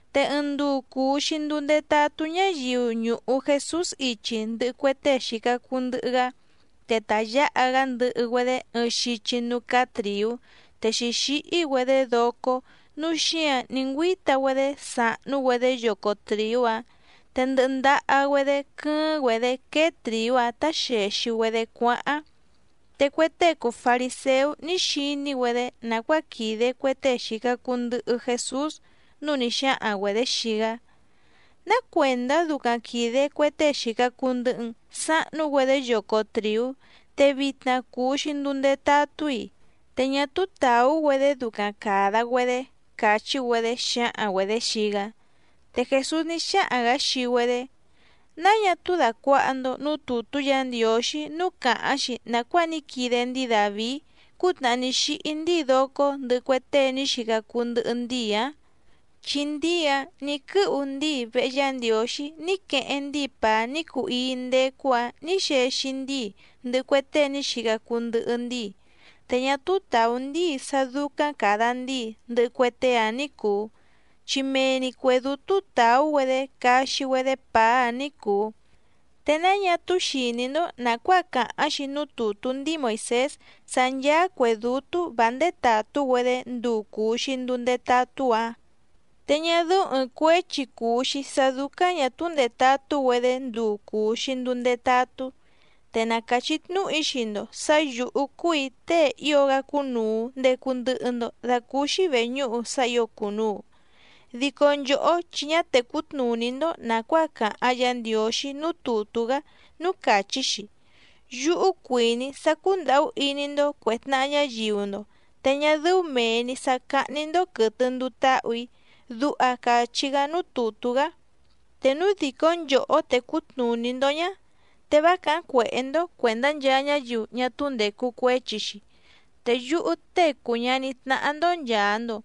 Te ɨɨⁿ nduu cùu‑xi nduu ndetatú ñáyiu ñùhu Jesús ichi ndɨhɨ cue tée xìca cuu ndɨhɨ‑gá, te ta yǎha‑gá ndɨhɨ‑güedé ɨɨⁿ xichi núú cáá trìú te xǐxíhí‑güedé docó nǔu xíǎⁿ ní ngüíta‑güedé sàhnú‑güedé yoco trìú‑áⁿ, te ndɨhɨ ndaha‑güedé quɨ́ɨ́ⁿ‑güedě quéé trìú‑áⁿ tá xèxi‑güedé cuáháⁿ. Te cue tée cùu fariséú ní xiní‑güedé nàcuáa quìde cue tée xìca cuu ndɨhɨ Jesús, núu ní xáhaⁿ‑güedě xii‑gá: —¿Ná cuèndá ducaⁿ quìde cue tée xìca cuu ndɨhɨ‑n sahnú‑güedé yoco trìú, te vitna cùu‑xi nduu ndetatú‑i? Te ñá túú tàú‑güedé ducaⁿ càda‑güedé —càchí‑güedé xǎhaⁿ‑güedě xii‑gá. Te Jèsús ní xáhaⁿ‑gǎ xii‑güedé: —¿Náa ñá túú dàcuaha‑ndo núú tùtú Yǎ Ndiǒxí núú càháⁿ‑xi nàcuáa ní quide ndíi Dàvií cútnàhá ní xíhí ndíi docó ndɨhɨ cue tée ní xica cuu ndɨhɨ ndíi‑ǎⁿ? Chi ndíi‑áⁿ nǐ quɨ́hu ndíi vehe Yá Ndiǒxí ní queheⁿ ndíi pàá ní cuu íí ndécú‑ǎⁿ nǐ xexi ndíi ndɨhɨ cue tée ní xica cuu ndɨhɨ ndíi, te ñá túú tàú ndíi sá dúcáⁿ càda ndíi ndɨhɨ cue tée‑áⁿ ní cùu, chi mee‑ni cuè dútú tàú‑güedé caxi‑güedé pàá‑áⁿ ní cùu. ¿Te náa ñá túú xìní‑ndó nàcuáa càháⁿ‑xi núú tùtú ndíi Moìsés sá ncháá cuè dútú vǎ ndétàtú‑güedé nduu cùu‑xi nduu ndetatú‑ǎⁿ? Te ñá dɨ́ú ɨ̀ɨⁿ cuéchi cùu‑xi sá dúcáⁿ ñà túú ndètatú‑güedé nduu cùu‑xi nduu ndetatú. Te na càchí tnúhu‑í xii‑ndo sǎ yǔhú cúù‑í tée ío‑gá cúnùu ndecu ndɨhɨ‑ndo dacúúxí vèñúhu sá ǐo cùnuu. Dico nchòhó chi ñá tècú tnùní‑ndó nàcuáa càháⁿ Yǎ Ndiǒxí núú tùtú‑gá núú càchí‑xi: “Yúhú cuìní‑í sá cúndàhú iní‑ndó cuè tnaha ñáyiu‑ndo te ñá dɨ́ú mèe‑ni sá cáhní‑ndó quɨ̀tɨ nduu táhù‑í”, duha càchí‑gá núú tùtú‑gá. Te núu dìcó nchòhó tècú tnùní‑ndó ñá, te vá càháⁿ cuèhé‑ndó cuèndá nchaa ñáyiu ñá túú ndècu cuéchi‑xi. Te yúhú Tée cùu ñaní tnáhá‑ndó nchàa‑ndo,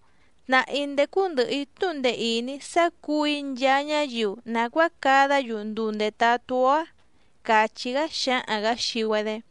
tnàhá‑í ndécú ndɨ̀hɨ‑í tnúhu ndee ìní sá cǔu‑í nchaa ñáyiu nàcuáa cadá‑yu nduu ndètatú‑ó‑á —càchí‑gá xǎhaⁿ‑gǎ xii‑güedé.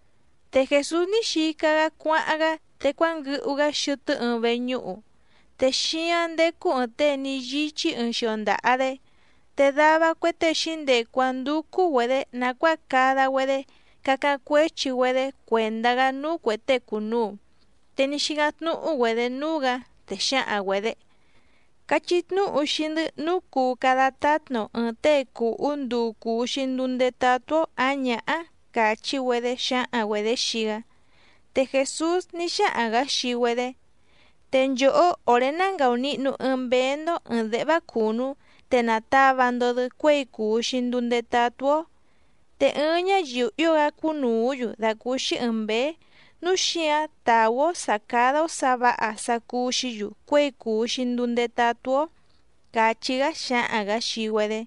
Te Jèsús ní xica‑gá cuáháⁿ‑gá, te cuánguɨhu‑gá xɨtɨ́ ɨɨⁿ veñúhu. Te xíáⁿ ndécú ɨ̀ɨⁿ tée ní yíchí ɨɨⁿ xio ndaha‑dé. Te dava cue tée xǐndecu‑áⁿ ndúcú‑güedě nàcuáa cada‑güedé cacáⁿ cuéchi‑güedé cuèndá‑gá núú cuè tée cùnuu, te ní xícáⁿ tnúhú‑güedě núú‑gǎ, te xǎhaⁿ‑güedě: —Cachí tnúhu xii‑ndɨ́ nǔu cuu cada tátna‑o ɨ̀ɨⁿ tée cùhú nduu cùu‑xi nduu ndetatú‑ó ǎⁿ ñǎhá —càchí‑güedé xǎhaⁿ‑güedě xii‑gá. Te Jèsús ní xáhaⁿ‑gǎ xii‑güedé: —Te nchòhó òré ná ngàunihnu ɨɨⁿ mbéé‑ndó ɨ̀ɨⁿ déhvá cùnú te nàtava‑ndo‑dɨ cuéi cùu‑xi nduu ndetatú‑ó. Te ɨɨⁿ ñáyiu ío‑gá cúnùú‑yu dàcúúxí ɨ̀ɨⁿ mbéé, núu xíǎⁿ tàú‑ó sǎ cádá‑ó sǎ vǎha sá cúú‑xǐ‑yu cuěi cùu‑xi nduu ndetatú‑ó —càchí‑gá xǎhaⁿ‑gǎ xii‑güedé.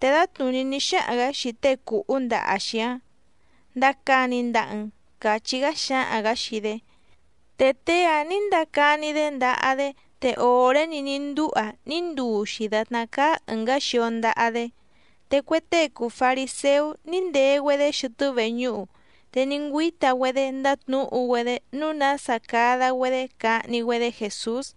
Te dǎtnùní ní xáhaⁿ‑gǎ xii tée cùhú ndaha‑xi‑áⁿ: —Ndacani ndaha‑n —càchí‑gá xǎhaⁿ‑gǎ xii‑dé. Te tée‑áⁿ nǐ ndacani‑dé ndaha‑dé, te òré‑ni ní ndúha ní nduu‑xi dàtná cáá ɨ̀ngá xio ndaha‑dé. Te cue tée cùu fariséú ní ndee‑güedé xɨtɨ́ veñúhu, te ní ngüíta‑güedé ndátnǔhu‑güedé nǔu nása cada‑güedé cahni‑güedé Jèsús.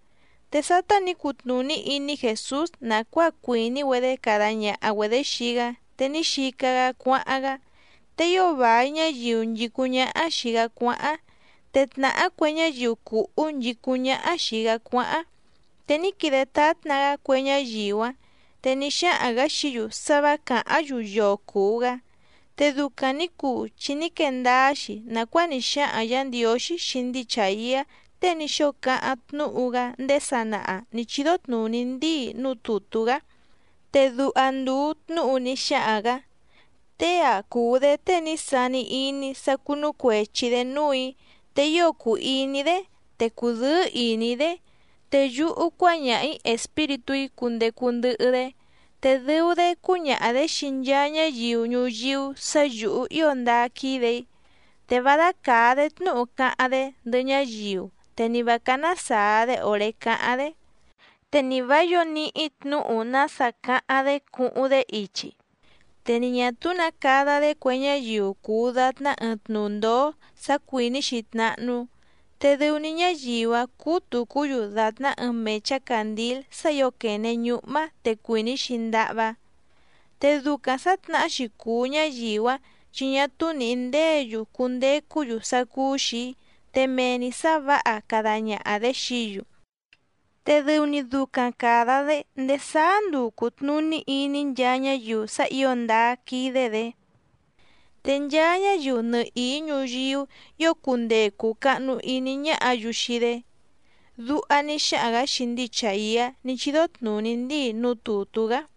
Te sátá nǐ cutnùní iní Jèsús nàcuáa cuìní‑güedé cada ñaha‑güedě xii‑gá te ní xica‑gá cuáháⁿ‑gá, te ío vài ñáyiu nchìcúⁿ ñáhá xìi‑gá cuáháⁿ, te tnàhá cue ñáyiu cùhú nchìcúⁿ ñáhá xìi‑gá cuáháⁿ, te ní quide tátna‑gá cue ñáyiu‑áⁿ. Te ní xáhaⁿ‑gǎ xií‑yu sá vǎ càháⁿ‑yu yoo cùu‑gá. Te ducaⁿ nǐ cuu chi ní quee ndáá‑xi nàcuáa ní xáhaⁿ Yǎ Ndiǒxí xii ndíi Chàiá tée ní xóo cáháⁿ tnúhu‑gá ndéé sanaha nǐ chídó tnùní ndíi núú tùtú‑gá, te duha ndùu tnúhu ní xáhaⁿ‑gǎ: Tée‑a cùu‑dé tée ní sani iní‑í sá cúnú cuèchi‑dé núù‑í, te ío cùu iní‑í‑dé, te cùdɨ́ɨ́ ìní‑í‑dé. Te yúhú cuáñaha‑ǐ Espíritú‑í cundecu ndɨhɨ‑dé, te dɨu‑dé cúñaha‑dě xii nchaa ñáyiu ñuyíú sǎ yǔhú ío ndáá quídè‑í. Te vá dácàá‑dé tnúhu cáháⁿ‑dé ndɨhɨ ñáyiu, te ni vǎ cáná sàa‑dé òré cáháⁿ‑dé, te ni vǎ yǒo níhí tnǔhu nása cáháⁿ‑dé cuhuⁿ‑dé ichi. Te ni ñà túú nǎ cada‑dé cue ñáyiu cùu datná ɨɨⁿ tnu ndǒó sá cuìní‑xi tnáhnú, te dɨu‑ni ñáyiu‑áⁿ cúú tùcú‑yu dàtná ɨɨⁿ mèchá càndíl sá ǐo quène ñúhmá te cuìní‑xi ndahvá. Te ducaⁿ sǎtnahá‑xi cùu ñáyiu‑áⁿ chi ñá túú nìhí ndéě‑yu cundecú‑yu sá cúú‑xì‑í, te mee‑ni sǎ vǎha cada ñaha‑dě xií‑yu, te dɨu‑ni ducaⁿ càda‑dé ndéé sáá nduu cùtnuní iní nchaa ñáyiu sá ǐo ndáá quídé‑dě. Te nchaa ñáyiu nɨhìí ñuyíú ǐo cundee cùu cahnu iní ñáhǎ‑yu xii‑dé. Duha ní xáhaⁿ‑gǎ xii ndíi Chàiá ní chídó tnùní ndíi núú tùtú‑gá.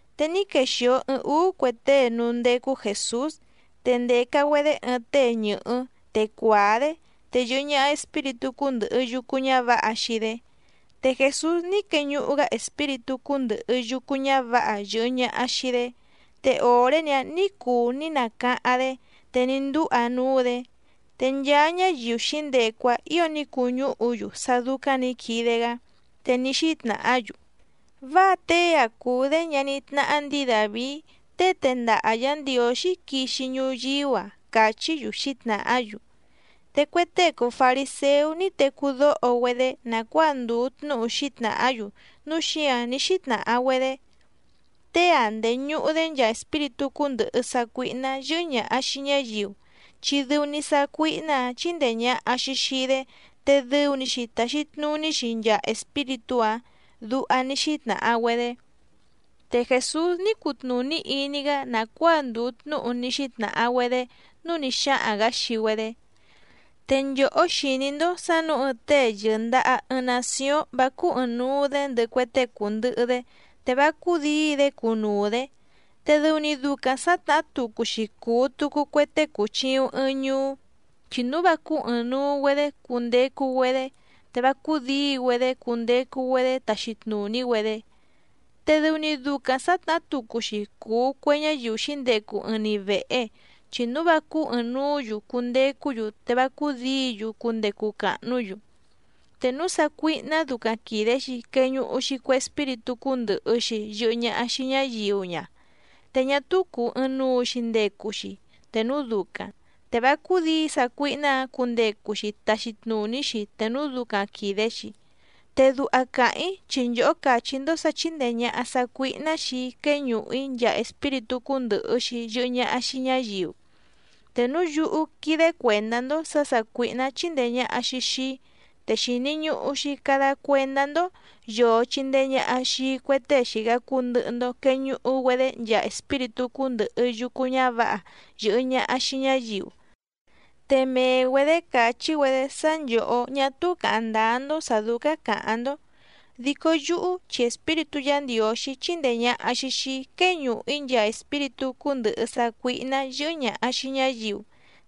Te ní quexìo ɨɨⁿ úú cue tée núú ndécú Jèsús, te ndèca‑güedé ɨɨⁿ tée ñɨ̀hɨ́ te cuàá‑dé, te yɨ̀hɨ ñaha espíritú cúndɨ̀hɨ yucu ñávǎha xii‑dé, te Jèsús ní queñuhu‑gá espíritú cúndɨ̀hɨ yucu ñávǎha yɨ̀hɨ ñaha xii‑dé, te òré‑ni‑áⁿ nǐ cuu ní nacáháⁿ‑dé te ní ndúha núú‑dě. Te nchaa ñáyiu xǐndecu‑áⁿ ǐo ní cuñúhu‑yu sá dúcáⁿ nǐ quide‑gá, te ní xítnàhá‑yu: —Váa tée‑a cùu‑dé ñaní tnáhá ndǐi Dàvií tée tendaha Yǎ Ndiǒxí quixi ñuyíú‑a —càchí‑yu xǐtnàhá‑yu. Te cue tée cùu fariséú ní tecú dóho‑güedé nàcuáa ndùu tnúhu xǐtnàhá‑yu, núu xíǎⁿ ní xítnàha‑güedé: —Tée‑a ndèñuhu‑dé nchaa espíritú cúndɨ̀hɨ sácuíhná yɨ́hɨ́ ñàha xii ñáyiu, chi dɨu‑ni sácuíhná‑ǎⁿ chíndèe ñaha‑xi xii‑dé te dɨu‑ni‑xi tàxi tnuní‑xi nchaa espíritú‑áⁿ —duha ní xítnàha‑güedé. Te Jèsús ní cutnùní iní‑gá nàcuáa ndùu tnúhu ní xítnàha‑güedé, núu ní xáhaⁿ‑gǎ xii‑güedé: —Te nchòhó xìní‑ndó sǎ nǔu ɨɨⁿ tée yɨ̀ndaha ɨɨⁿ nacióⁿ vá cúú ɨ̀ɨⁿnuu‑dé ndɨhɨ cue tée cùndɨhɨ‑dé, te vá cúdǐi‑dé cunuu‑dě. Te dɨu‑ni ducaⁿ sǎtnahá tucu‑xi cùu tucu cue tée cùchiuⁿ ɨɨⁿ ñuú, chi núu vá cúú ɨ̀ɨⁿnuu‑güedé cundecu‑güedé, te vá cúdǐi‑güedé cundecu‑güedé taxi tnùní‑güedé. Te dɨu‑ni ducaⁿ sǎtnahá tucu‑xi cùu cue ñáyiu xǐndecu ɨɨⁿ‑ni vèhe, chi núu vá cúú ɨ̀ɨⁿnuú‑yu cundecú‑yu te vá cúdǐi‑yu cundecu càhnú‑yu. Te núu sácuíhná ducaⁿ quìde‑xi queñuhu‑xi cue espíritú cúndɨ̀hɨ‑xi yɨhɨ ñaha xii ñáyiu ña, te ñá túú cùu ɨɨⁿnuu‑xi ndecu‑xi te núu ducaⁿ, te vá cúdǐi sácuíhná‑ǎⁿ cundecu‑xi taxi tnùní‑xi te núu ducaⁿ quìde‑xi. Te duha càháⁿ‑í chi nchòhó càchí‑ndó sǎ chíndèe ñaha sácuíhná xii‑í quéñùhu‑í nchaa espíritú cúndɨ̀hɨ‑xi yɨhɨ ñaha xii ñáyiu. Te núu yúhú quídé cuèndá‑ndó sǎ sàcuíhná chíndèe ñaha‑xi xii‑í, te xìni ñuhu‑xi cada cuendá‑ndó yòo chindee ñaha xii cue tée xìca cuu ndɨhɨ‑ndo queñuhu‑güedé nchaa espíritú cúndɨ̀hɨ yucu ñávǎha yɨ̀hɨ ñaha xii ñáyiu. Te mee‑güedě càchí‑güedé sá nchòhó ñá túú càháⁿ ndáá‑ndó sǎ dúcáⁿ càháⁿ‑ndó. Dico yúhú chi Espíritú Yǎ Ndiǒxí chíndèe ñaha‑xi xii‑í quéñùhu‑í nchaa espíritú cúndɨ̀hɨ sácuíhná yɨ́hɨ́ ñàha xii ñáyiu,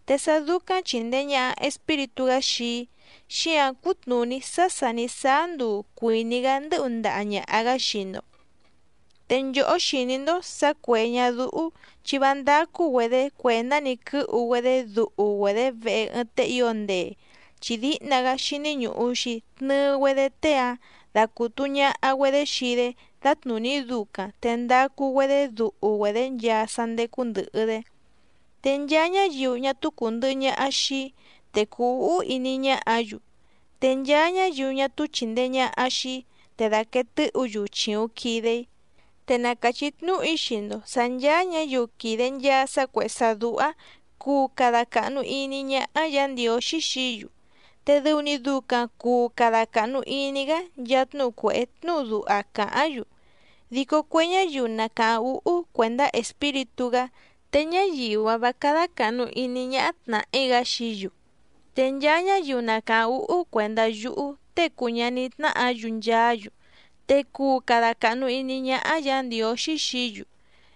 te sá dúcáⁿ chìndee ñaha Espíritú‑gá xii‑í, xíǎⁿ cútnùní sá sà ní sáá nduu cuìní‑gá ndɨ́hu ndaha ñàha‑gá xii‑ndo. ’Te nchòhó xìní‑ndó sǎ cuè ñadúhú chi vá ndácú‑güedě cuèndá‑ni quɨ́hu‑güedé duhu‑güedě vehe ɨɨⁿ tée ío ndee, chi díhna‑gá xíní ñùhu‑xi tnɨɨ‑güedé tée‑áⁿ dacùtu ñaha‑güedé xii‑dé dǎtnùní ducaⁿ te ndacu‑güedé duhu‑güedě nchaa sá ndécú ndɨ̀hɨ‑dé. ’Te nchaa ñáyiu ñá túú cùndɨhɨ ñaha xii‑í, te cùu úhú iní ñáhǎ‑yu. Te nchaa ñáyiu ñá túú chìndee ñaha xii‑í, te dàquee tɨ́hǔ‑yu chìuⁿ quide‑í. ’Te na càchí tnúhu‑í xii‑ndo sǎ ncháá ñǎyiu quìde nchaa sá cuèhé sá dúhá cuu cada càhnu iní ñáhá Yǎ Ndiǒxí xií‑yu, te dɨu‑ni ducaⁿ cùu cada cahnu iní‑gá nchaa tnúhu cuèhé tnúhu duha càháⁿ‑yu. Dico cue ñáyiu na càháⁿ úhú cuèndá Espíritú‑gá, te ñáyiu‑áⁿ vǎ cádá càhnu iní ñáhá tnàhí‑gá xií‑yu. Te nchaa ñáyiu na càháⁿ úhú cuèndá yúhú Tée cùu ñaní tnáhǎ‑yu nchaá‑yu, te cuu cada càhnu iní ñáhá Yǎ Ndiǒxí xií‑yu.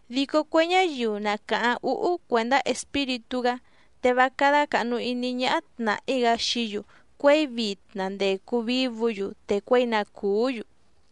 Dico cue ñáyiu na càháⁿ úhú cuèndá Espíritú‑gá te vá cádá càhnu iní ñáhá tnàhí‑gá xií‑yu cuěi vitna ndècu vívǔ‑yu, te cuěi na cùú‑yu.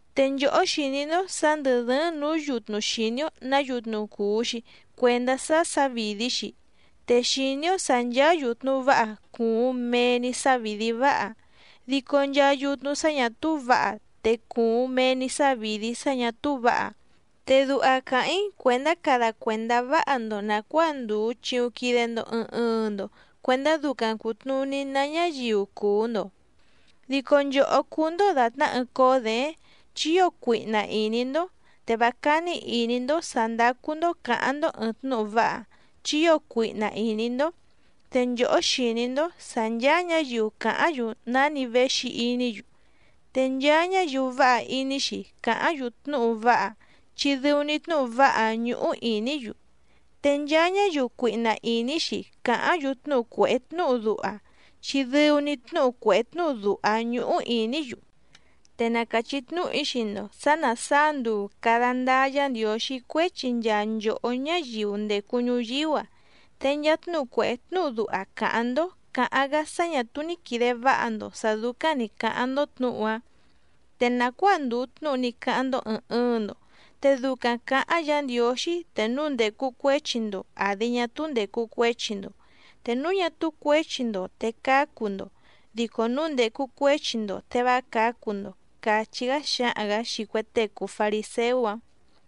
’Te nchòhó xìní‑ndó sǎ ndɨ̀ dɨ́ɨ́ⁿ nǔú yutnu xìní‑ó nǎ yutnu cùu‑xi cuendá sá sǎvìdí‑xi, te xìní‑ó sǎ ncháá yùtnu váha cùuⁿ mee‑ni sávìdí váha, dico nchaa yutnu sá ñà túú vǎha te cùuⁿ mee‑ni sávìdí sá ñà túú vǎha. Te duha càháⁿ‑í cuèndá cada cuèndá váha‑ndo nàcuáa ndùu chiuⁿ quide‑ndo ɨɨⁿ ɨɨⁿ‑ndo cuendá ducaⁿ cùtnuní ná ñáyiu cùu‑ndo. Dico nchòhó cúú‑ndó dàtná ɨɨⁿ cóó děéⁿ chi ío cuihna ìní‑ndó, te vá cání ìní‑ndó sǎ ndácú‑ndó cǎháⁿ‑ndó ɨ̀ɨⁿ tnúhu váha, chi ío cuihna ìní‑ndó. Te nchòhó xìní‑ndó sǎ ncháá ñǎyiu càháⁿ‑yu náni véxi iní‑yu. Te nchaa ñáyiu váha iní‑xi càháⁿ‑yu tnúhu váha, chi dɨu‑ni tnúhu váha‑áⁿ ñúhú ìní‑yu. Te nchaa ñáyiu cuihna ìní‑xi càháⁿ‑yu tnúhu cuèhé tnúhu duha, chi dɨu‑ni tnúhu cuèhé tnúhu duha‑áⁿ ñúhú ìní‑yu. Te na càchí tnúhu‑í xii‑ndo sǎ ná sàá nduu càda ndáá Yǎ Ndiǒxí cuéchi nchaa nchòhó ñáyiu ndècu ñuyíú‑a, te nchaa tnúhu cuèhé tnúhu duha càháⁿ‑ndó cǎháⁿ‑gá sá ñà túú ní quìde váha‑ndo sǎ dúcáⁿ nǐ cáháⁿ‑ndó tnǔhu‑áⁿ. Te nàcuáa ndùu tnúhu ní cáháⁿ‑ndó ɨ̀ɨⁿ ɨɨⁿ‑ndo, te ducaⁿ cǎháⁿ Yǎ Ndiǒxí te núu ndècu cuéchi‑ndo àdi ñá túú ndècu cuéchi‑ndo. Te núu ñá túú cuěchi‑ndo te cácu‑ndo, dico núu ndècu cuéchi‑ndo te vá cǎcu‑ndo —càchí‑gá xǎhaⁿ‑gǎ xii cue tée cùu fariséú‑áⁿ.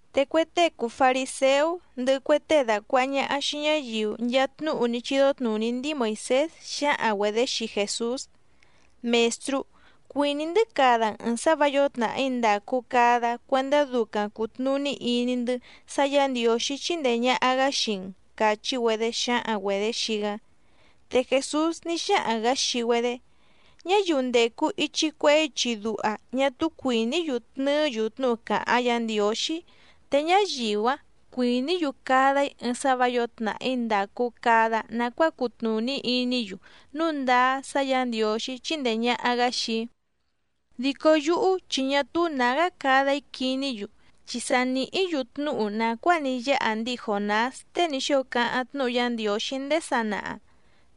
Te cue tée cùu fariséú, ndɨhɨ cue tée dàcuaha ñaha xii ñáyiu nchaa tnúhu ní chídó tnùní ndíi Moìsés xǎhaⁿ‑güedě xii Jèsús: —Mèstrú, cuìní‑ndɨ́ cada‑n ɨ̀ɨⁿ sá vǎ yǒo tnàhí ndàcu cada cuendá ducaⁿ cùtnuní iní‑ndɨ́ sá Yǎ Ndiǒxí chíndèe ñaha‑gá xii‑n —càchí‑güedé xǎhaⁿ‑güedě xii‑gá. Te Jèsús ní xáhaⁿ‑gǎ xii‑güedé: —Ñáyiu ndècu ichi cuehé ichi duha ñá túú cuìní‑yu tnɨɨ́‑yu tnúhu càháⁿ Yǎ Ndiǒxí, te ñáyiu‑áⁿ cuìní‑yu cada‑í ɨɨⁿ sá vǎ yǒo tnàhí ndàcu cada nacuáa cutnùní iní‑yu núu ndáá sá Yǎ Ndiǒxí chíndèe ñaha‑gá xii‑í. Dico yúhú chi ñá túú nǎgá cada‑í quiní‑yu, chi sa nìhí‑yu tnúhu nàcuáa ní yáha ndíi Jònás tée ní xóo cáháⁿ tnúhu Yá Ndiǒxí ndéé sanaha,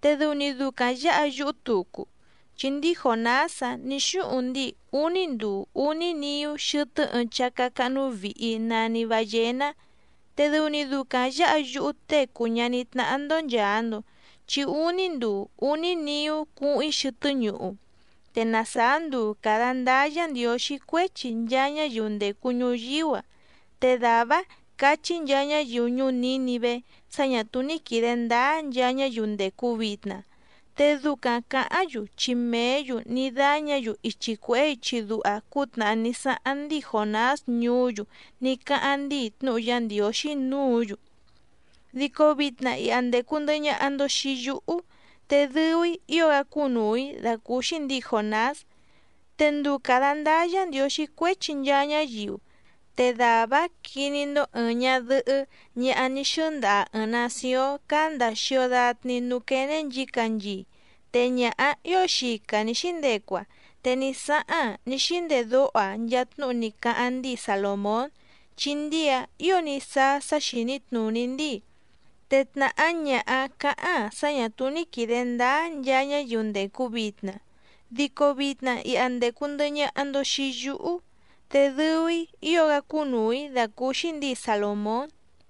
te dɨu‑ni ducaⁿ yǎha yúhú tucu. Chi ndíi Jònás‑áⁿ nǐ xúhuⁿ ndíi úní nduu úní niú xɨtɨ́ ɨɨⁿ chácá cáhnú vìhi nani ballená. Te dɨu‑ni ducaⁿ yǎha yúhú Tée cùu ñaní tnáhá‑ndó nchàa‑ndo, chi úní nduu úní niú cuhuⁿ‑í xɨtɨ́ ñuhu. Te na sàá nduu càda ndáá Yǎ Ndiǒxí cuéchi nchaa ñáyiu ndècu ñuyíú‑a, te dàvá‑áⁿ cachí nchaa ñáyiu ñuú Nǐnivé sá ñà túú ní quìde ndáá nchaa ñáyiu ndècu vitna, te ducaⁿ cǎháⁿ‑yu chi mèé‑yu ní dáñǎ‑yu ichi cuèhé ichi duha cútnàhá ní sáháⁿ ndíi Jònás ñuú‑yu ní cáháⁿ ndíi tnúhu Yá Ndiǒxí núǔ‑yu. Dico vitna iha ndècu ndɨhɨ ñaha‑ndo xii yúhú, te dɨu‑í ío‑gá cúnùu‑í dàcúúxí ndǐi Jònás. Te nduu càda ndáá Yǎ Ndiǒxí cuéchi nchaa ñáyiu, te dàvá‑áⁿ quiní‑ndó ɨ̀ɨⁿ ñadɨhɨ́ ñaha ní xɨ́ndaha ɨ̀ɨⁿ nacióⁿ cáá ndàa xio datni núú quéné nchǐcanchii, te ñaha‑áⁿ ǐo xica nǐ xíndecu‑aⁿ te ní sáháⁿ‑aⁿ ní xíndedóho‑aⁿ nchaa tnúhu ní cáháⁿ ndíi Salòmón, chi ndíi‑áⁿ ǐo ní sáá sá xìní tnùní ndíi. Te tnàhá ñaha‑áⁿ cǎháⁿ‑aⁿ sá ñà túú ní quìde ndáá nchaa ñáyiu ndècu vitna. Dico vitna iha ndècu ndɨhɨ ñaha‑ndo xii yúhú, te dɨu‑í ío‑gá cúnùu‑í dàcúúxí ndǐi Salòmón.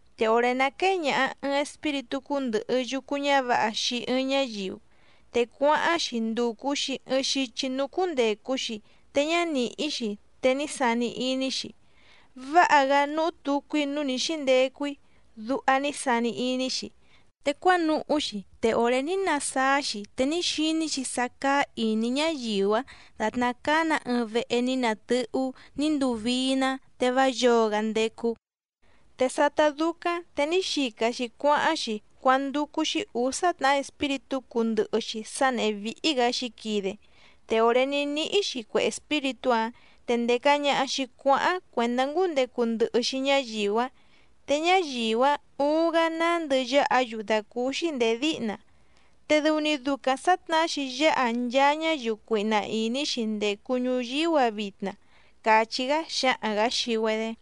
’Te òré ná quéé ñàha ɨɨⁿ espíritú cúndɨ̀hɨ yucu ñávǎha xii ɨɨⁿ ñáyiu, te cuáháⁿ‑xi ndùcu‑xi ɨɨⁿ xichi núú cúndècu‑xi te ñá nìhí‑xi te ní sani iní‑xi: “Váha‑gá núhú tucu‑í núú nǐ xíndecu‑í”, duha ní sani iní‑xi. Te cuánuhú‑xi, te òré ní nasáá‑xi, te ní xiní‑xi sá cáá ìní ñáyiu‑áⁿ dàtná cáá‑nǎ ɨɨⁿ vehe ní natɨ́hú ní nduu vií‑ná te vá yǒo‑gá ndécú. Te sátá dúcáⁿ te ní xica‑xi cuáháⁿ‑xi cuándúcú‑xí ǔsá tnàhá espíritú cúndɨ̀hɨ‑xi sá nèhé víhí‑gǎ xǐquide. Te òré ní níhí‑xi cue espíritú‑áⁿ te ndèca ñaha‑xi cuáháⁿ cuèndá ngúndecu ndɨhɨ‑xi ñáyiu‑áⁿ. Te ñáyiu‑áⁿ uuⁿ‑gá nándɨ yáha‑yu dàcúúxí ndèé díhna. Te dɨu‑ni ducaⁿ sǎtnahá‑xi yáha nchaa ñáyiu cuihna ìní‑xi ndècu ñuyíú‑a vitna —càchí‑gá xǎhaⁿ‑gǎ xii‑güedé.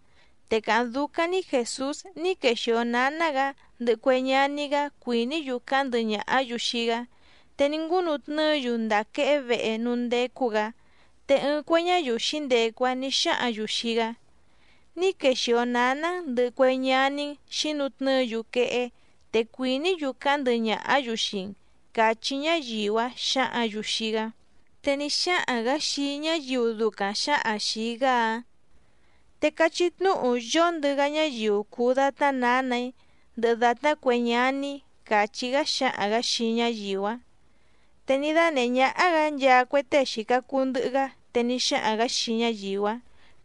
Te càháⁿ dúcáⁿ‑ní Jèsús ní quexìo náná‑gǎ ndɨhɨ cue ñaní‑gá cuìní‑yu cáháⁿ ndɨhɨ ñàhá‑yu xii‑gá, te ní ngúnu tnɨ́ɨ‑yu ndàa quehé vehe núú ndécú‑gǎ. Te ɨɨⁿ cue ñáyiu xǐndecu‑áⁿ nǐ xáhǎⁿ‑yu xii‑gá: —Ní quexìo náná‑n ndɨ̀hɨ cue ñaní‑n xǐnutnɨ́ɨ‑yu quehé, te cuìní‑yu cáháⁿ ndɨhɨ ñàhá‑yu xii‑n —càchí ñáyiu‑áⁿ xǎhǎⁿ‑yu xii‑gá. Te ní xáhaⁿ‑gǎ xii ñáyiu ducaⁿ xǎhaⁿ xìi‑gá‑áⁿ: —Te cachí tnúhu yóndɨ‑gá ñáyiu cùu datná nǎnà‑í ndɨhɨ dàtná cue ñaní‑í —càchí‑gá xǎhaⁿ‑gǎ xii ñáyiu‑áⁿ. Te ní dánèhé ñáhá‑gǎ nchaa cue tée xìca cuu ndɨhɨ‑gá, te ní xáhaⁿ‑gǎ xii ñáyiu‑áⁿ: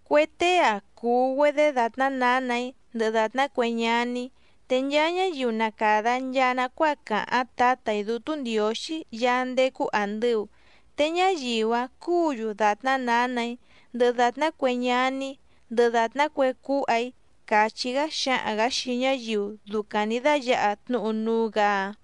—Cue tée‑a cùu‑güedé dàtná nǎnà‑í, ndɨhɨ dàtná cue ñaní‑í. Te nchaa ñáyiu na càda nchaa nacuáa càháⁿ Tǎtà‑í Dútú Ndiǒxí Yaá ndécú àndɨu, te ñáyiu‑áⁿ cúǔ‑yu dàtná nǎnà‑í, ndɨhɨ dàtná cue ñaní‑í, ndɨhɨ dàtná cue cúha‑í —càchí‑gá xǎhaⁿ‑gǎ xii ñáyiu ducaⁿ nǐ dáyǎha tnúhu núú‑gǎ‑áⁿ.